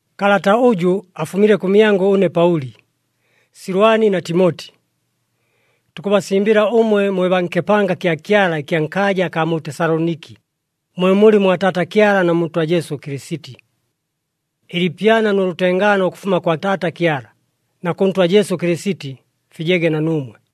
Kalata ʉjʉ afumile kʉmyangʉ ʉne Paʉli, Silwani na Timoti. Tukʉbasimbɨla ʉmwe mwe baa nkɨpanga kya Kyala ɨkya nkaaja akaa mu Tesaloniki, mwe mulɨ mwa Taata Kyala na mu Ntwa Jesu Kɨlɨsiti. Ɨliipyana nʉ lʉtengaano ʉkʉfuma kwa Taata Kyala na kʉ Ntwa Jesu Kɨlɨsiti, fijege na nuumwe.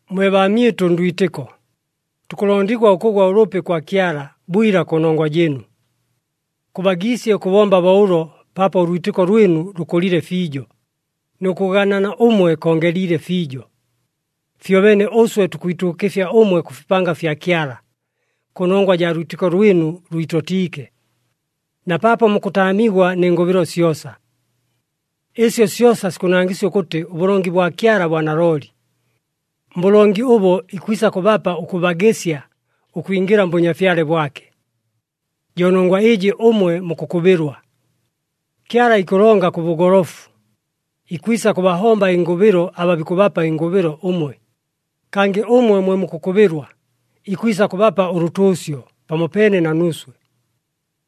Mwe baamyɨtʉ ndwitɨko, tukʉlondigwa ʉkʉgwa ʉlʉpi kwa Kyala bwila kʉnongwa jɨɨnu. Kʉbagiisye ʉkʉbomba bo ʉlo paapo ʉlwitɨko lwɨnu lʉkʉlile fiijo, nʉ kʉganana ʉmwe kongeliile fiijo. Fyobeene ʉswe tukwituukɨfya ʉmwe kʉ fipanga fya Kyala, kʉnongwa jaa lwitɨko lwɨnu lwitotiike, na paapo mukʉtaamigwa nɨ ngʉbɨlo syosa. Ɨsyo syosa sikʉnangɨsya ʉkʉtɨ ʉbʉlongi bwa Kyala bwa nalooli. Mbʉlongi ʉbo ikwisa kʉbapa ʉkʉbagɨsya ʉkwingɨla mBʉnyafyale bwake. Jo nongwa ɨjɨ ʉmwe mukʉkʉbɨlwa. Kyala ikʉlonga kʉ bʉgolofu, ikwisa kʉbahomba ɨngʉbɨlo aba bikʉbapa ɨngʉbɨlo ʉmwe, kangɨ ʉmwe mwe mukʉkʉbɨlwa ikwisa kʉbapa ʉlʉtʉʉsyo pamopeene na nuuswe.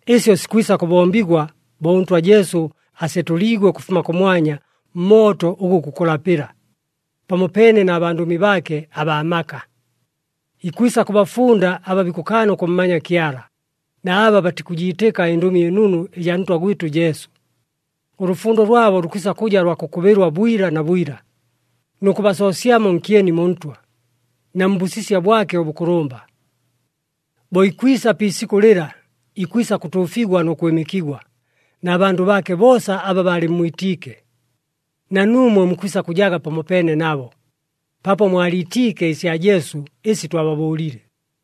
Ɨsyo sikwisa kʉbombigwa bo ʉNtwa Jesu asetʉliigwe ʉkʉfuma kʉmwanya mmooto ʉgʉ gukʉlapɨla, pamopeene na bandʉmi baake abaa maka. Ikwisa kʉbafunda aba bikʉkaana ʉkʉmmanya Kyala, na aba batikʉjiitɨka ɨNdʉmi ɨNunu ɨjaa Ntwa gwɨtʉ Jesu. Ʉlʉfundo lwabo lukwisa kʉja lwa kʉkʉbɨlwa bwila na bwila, nʉ kʉbasoosyamo nkyeni mu Ntwa, na mbʉsisya bwake ʉbʉkʉlʉmba. Bo ikwisa pi isikʉ lɨla ikwisa kʉtuufigwa nʉ kwɨmɨkigwa na bandʉ baake boosa aba baalɨmmwitiike. Na nuumwe mukwisa kʉjaga pamopeene nabo, paapo mwaliitiike ɨsya Jesu ɨsi twababʉʉlile.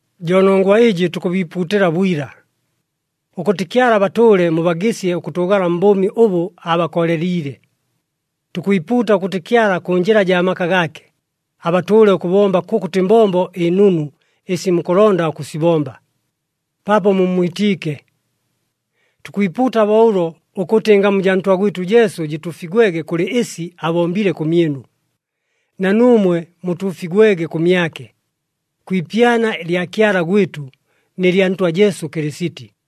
Jo nongwa ɨjɨ tukʉbiipuutɨla bwila, ʉkʉtɨ Kyala abatʉʉle mubagɨsye ʉkʉtʉʉgala mbʉʉmi ʉbʉ aabakooleliile. Tukwipuuta ʉkʉtɨ Kyala kʉ njɨla jaa maka gaake, abatʉʉle ʉkʉbomba kʉkʉtɨ mbombo ɨnunu ɨsi mukʉlonda ʉkʉsibomba, paapo mummwitiike. Tukwipuuta bo ʉlo, ʉkʉtɨ ɨngamu jaa Ntwa gwɨtʉ Jesu jɨtuufigwege kʉlɨ ɨsi abombile kʉmyɨnu, na nuumwe mutuufigwege kʉmyake, kwi ipyana lya Kyala gwɨtʉ, nɨ lya Ntwa Jesu Kɨlɨsiti.